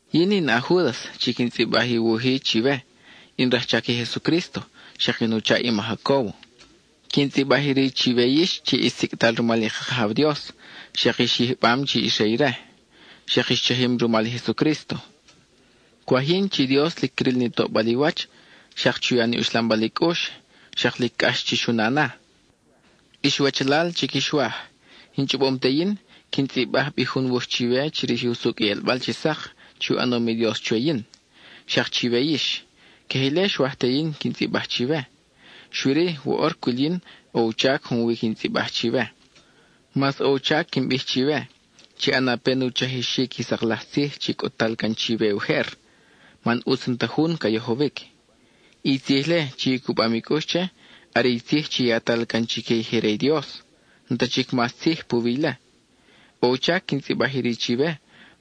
Yin in a-Júdas chi quin tzʼibaj i wuj-i chiwe; in rajchac i Jesucrísto xak in u chaʼ i ma Jacóbo. Quin tzʼibaj iri chiwe yix chi ix sicʼtal rumal i ka Kajaw Dios, xak ix yijbam chic ix re ire, xak ix chajim rumal i Jesucrísto. Cwaj yin chi i Dios lic cril ni toʼbal i wach, xak chu ya ni uxlambal i cʼux, xak lic cʼax chix u na na. Ix wachalal chi quix waj, in chʼobom te yin, quin tzʼibaj bi jun wuj chiwe chirij usucʼ i ʼelbal chi sak chi u ʼanom i Dios chwe yin, xak chiwe yix; queje ile xwaj te yin quin tzʼibaj chiwe. Xui-ri woʼor cwil yin ʼo u chac junwi quin tzʼibaj chiwe. Mas ʼo u chac quin bij chiwe, chi ʼana pen u chajixic i sak laj tzij chi cʼut-tal can chiwe ujer, man ʼutz n-ta jun ca yojowic. I tzij-le chi i cubam i cʼux che, are i tzij chi yatal can chique i je re i Dios; n-ta chic mas tzij puwi ile. ʼO u chac quin tzʼibaj iri chiwe,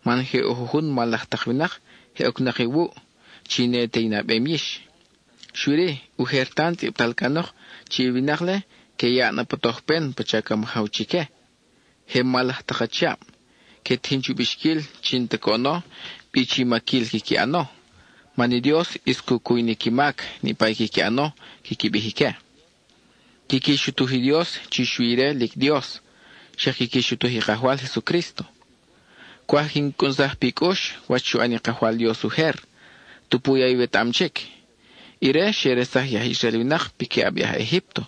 man je ʼo jujun mal laj tak winak je ocnak iwuʼ, chi ne te i nabem yix. Xui-ri, ujer tan tzʼibtal canok chi i winak-le que yaʼ na pa tojpen pacha ca majaw chique. Je mal laj tak achiab; que tijin chu bixquil chi n-ta coʼono bi chi maquil quiqui ʼano, man i Dios ʼis cu cuy ni qui mac, niʼpa i quiqui ʼano, quiqui bij ique. Quiqui xutuj i Dios chi xui ire lic Dios; xak quiqui xutuj i Kajwal Jesucrísto. Cwaj quin cʼunsaj pi cʼux wach xu ʼan i Kajwal Dios ujer, tupu ya iwetaʼam chic. Ire xe resaj i aj Israel winak piquiʼab i aj Egípto;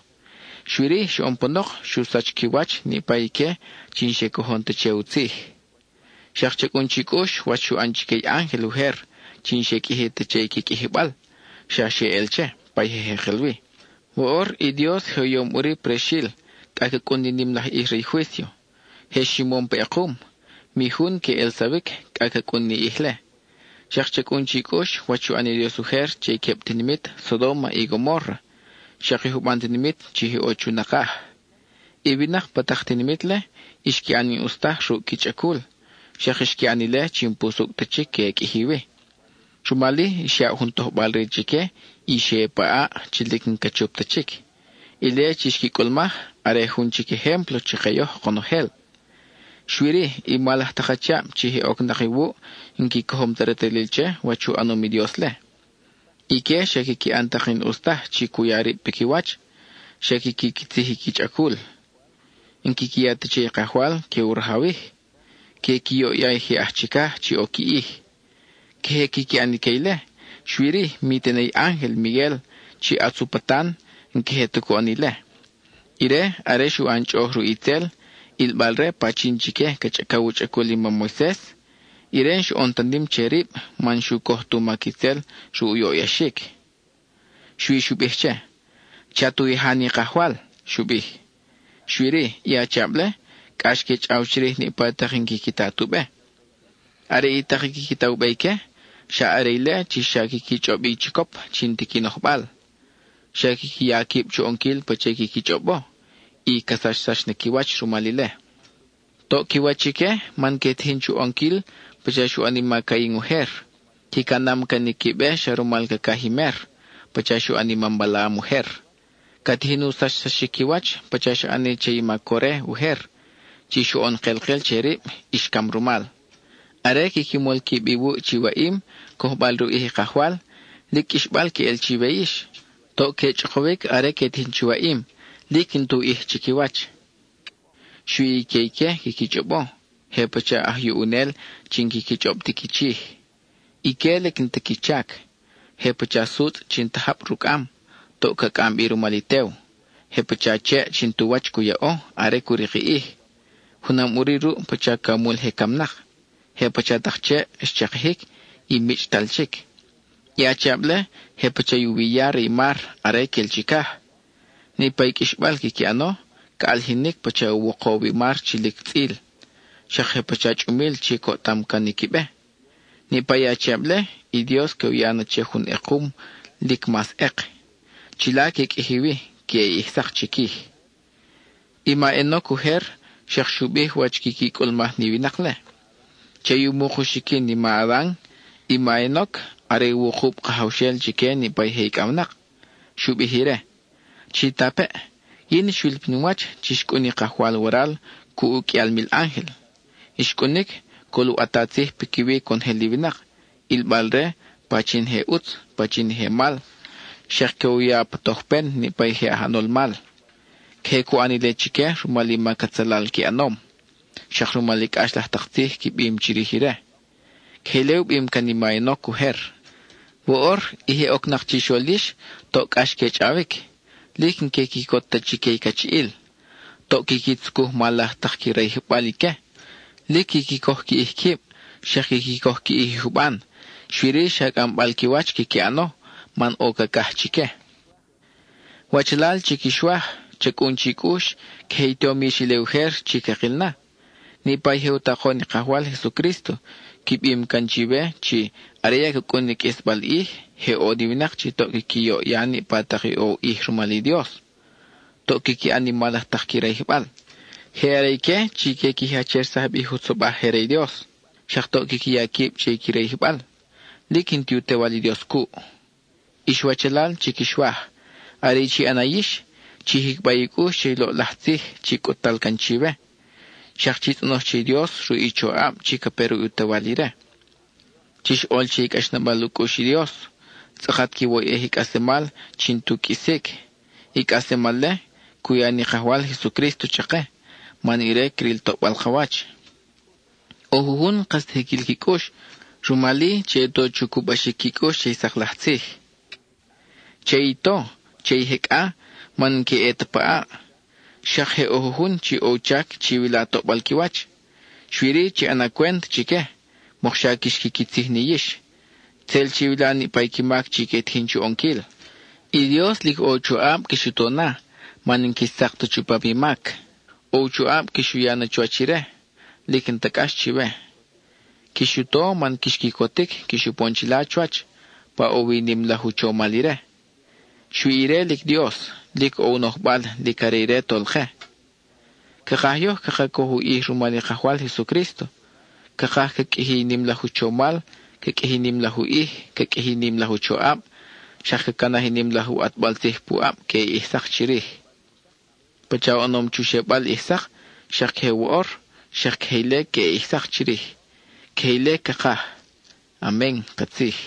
xui-ri xoʼon panok xu sach qui wach niʼpa ique chi n-xe cojon ta che u tzij. Xak cha cʼun chi cʼux wach xu ʼan chique i ángel ujer chi n-xe qʼuiji ta che i qui qʼuijibal, xa xe ʼel che, pa i je jekel wi. Woʼor i Dios je u yom ʼuri prexil cʼa ca cʼun ni nim laj ʼij re i juício; je ximom pa ʼekum; mi jun que ʼelsa-wic cʼa ca cʼun ni ʼij-le. Xak cha cʼun chi cʼux wach xu ʼan i Dios ujer che i queb tinimit Sodóma y Gomórra, xak i juban tinimit chi je ʼo chu nakaj. I winak pa tak tinimit-le, xqui ʼan i n-ʼus taj ruʼ qui chʼacul; xa xqui ʼan ile chi n-pusucʼ ta chic que qʼuiji wi. Rumal-i, xyaʼ jun tojbal-re chique y xe ʼe pa ʼaʼ chi lic n-ca chup ta chic. Ile chi xqui cʼulmaj, are jun chic ejémplo chake yoj konojel. Xui-ri, i mal laj tak achiab chi je ocnak iwuʼ n-qui cojom ta retalil che wach u ʼanom i Dios-le. Ique xa quiqui ʼan tak i n-ʼus taj chi cu ya rib piquiwach; xa quiqui quitzij i qui chʼacul; n-quiqui ya ta che i Kajwal que u rajawij; que qui yoʼya i je aj chicaj chi ʼo qui ʼij. Queje quiqui ʼan ique ile, xui-ri mi tene i ángel Miguel, chi ʼatz u patan, n-queje ta cu ʼan ile. Ire, are xu ʼan chʼoʼoj ruʼ itzel, ʼilbal-re pachin chique ca chʼacaw u chʼacul i mam Moises, ire n-xoʼon ta nim che rib man n-xu coj tu mac itzel ruʼ u yoʼyaxic. Xui xu bij che: “Chat u yaja ni Kajwal,” xu bij. Xui-ri, i achiab-le cʼax que chʼaw chirij niʼpa tak i n-quiqui ta tu be. Are i tak i quiqui ta u be ique, xa are ile chi xak quiqui chʼob i chicop chi n-ti qui nojbal. Xa quiqui ya quib chu ʼonquil pacha i quiqui chʼobo, y xa ca sachsax na qui wach rumal ile. Toʼ qui wach ique, man que tijin chu ʼonquil pacha xu ʼan i ma Cain ujer. Qui canam can i qui be xa rumal cacaj i mer, pacha xu ʼan i mam Balaam ujer. Ca tijin u sachsaxic qui wach pacha xa ʼani che i ma Core ujer, chi xoʼon kelkel che rib y xcam rumal. Are quiqui mol quib iwuʼ chi waʼim, cojbal re u ʼij i Kajwal, lic qʼuixbal queʼel chiwe yix; toʼ que chʼokowic are que tijin chi waʼim, lic n-tu ʼij chiquiwach. Xui i que ique quiqui chʼobo; je pacha aj yuʼunel chi n-quiqui chʼob ti qui chij. Ique lic n-ta qui chac; je pacha sutzʼ chi n-ta jab rucʼam, toʼ ca cʼam bi rumal i tew. Je pacha cheʼ chi n-tu wach cu yaʼo are cu rik i ʼij; junam ʼuri ruʼ pacha camul je camnak. Je pacha tak cheʼ xchakijic y michʼtal chic. I achiab-le je pacha i u wi ya re i mar are quel chicaj. Niʼpa i qʼuixbal quiqui ʼano ca ʼalijinic pacha u wokow i mar chi lic tzʼil. Xak je pacha chʼumil chi coʼtam can qui be. Niʼpa i achiab-le, i Dios que u ya na che jun ʼekum lic mas ʼek. Chila que qʼuiji wi queʼe ʼij sak chiquij. I ma Enoc ujer xak xu bij wach quiqui cʼulmaj ni winak-le. Che i u muk u xiquin i ma Adan, i ma Enoc are wukub kajawxel chique niʼpa i je icʼawnak. Xu bij ire: “Chitapeʼ, yin xwil pin wach chi xcʼun i Kajwal waral cuʼ u qʼuial mil ángel. Xcʼunic, col u ʼata tzij piquiwi conojel i winak, ʼilbal-re pachin i je ʼutz, pachin i je mal, xak que u ya pa tojpen niʼpa i je aj ʼanol mal. Queje cu ʼan ile chique rumal i mac atzalal qui ʼanom, xak rumal i cʼax laj tak tzij qui bim chirij ire.” Queje ile u bim can i ma Enoc ujer. Woʼor, i je ocnak chixol yix, toʼ cʼax que chʼawic; lic n-que quicot ta chique i cachiʼil. Toʼ quiqui tzucuj i mal laj tak qui rayijbal ique. Lic quiqui coj qui ʼij quib, xak quiqui coj qui ʼij i juban, xui-ri, xa cʼambal qui wach quiqui ʼano, man ʼo cacaj chique. Wachalal chi quix waj, cha cʼun chi cʼux, queje i tom yix ile ujer chi cakil na. Niʼpa i je u takon i Kajwal Jesucrísto qui bim can chiwe chi “Are ya ca cʼun i qʼuisbal ʼij, je ʼo ni winak chi toʼ quiqui yoʼya niʼpa tak i ʼo u ʼij rumal i Dios; toʼ quiqui ʼan i mal laj tak qui rayijbal.” Je are ique chi que qui jachersaj bi i jutzobaj je re i Dios; xak toʼ quiqui ya quib che i qui rayijbal; lic n-ti u Tewal i Dios cuʼ. Ix wachalal chi quix waj, are i chi ʼana yix, chi jicba i cʼux che i loʼlaj tzij chi cʼut-tal can chiwe. Xak chi tzʼonoj che i Dios ruʼ i choʼab chi ca pe ruʼ u Tewal ire. Chix ʼol che i cʼaxnabal u cʼux i Dios, tzʼakat quiwoyʼej i cʼaslemal chi n-tu qʼuisic; i cʼaslemal-le, cu ya ni Kajwal Jesucrísto chake man ire cril toʼbal ka wach. ʼO jujun n-kas ta jiquil qui cʼux; rumal-i, che i to chu cubaxic qui cʼux che i sak laj tzij. Che i to, che i jecʼa, man n-que ʼe ta pa ʼaʼ. Xak je ʼo jujun chi ʼo u chac chiwila toʼbal qui wach, xui-ri chi ʼana cwent chique, mokxa quix quiquitzij ni yix; tzel chiwila ni qui mac chi que tijin chu ʼonquil. I Dios lic ʼo i u choʼab quix u to na, man n-quix tzak ta chupam i mac; ʼo u choʼab quix u ya na chuwach ire, lic n-ta cʼax chiwe. Quix u to, man quix quicotic quix upon chila chuwach, pa ʼo wi i nim laj u chomal ire. Xui ire lic Dios, lic ʼo u nojbal, lic are ire i Tolke. Cakaj yoj caka coj u ʼij rumal i Kajwal Jesucrísto; cakaj ca qʼuiji i nim laj u chomal, ca qʼuiji i nim laj u ʼij, ca qʼuiji i nim laj u choʼab, xak ca canaj i nim laj ʼatbal tzij puʼab queʼe ʼij sak chirij. Pacha oʼonom chu xebal ʼij sak, xak queje woʼor, xak queje ile queʼe ʼij sak chirij; queje ile cakaj. Amen (katzij).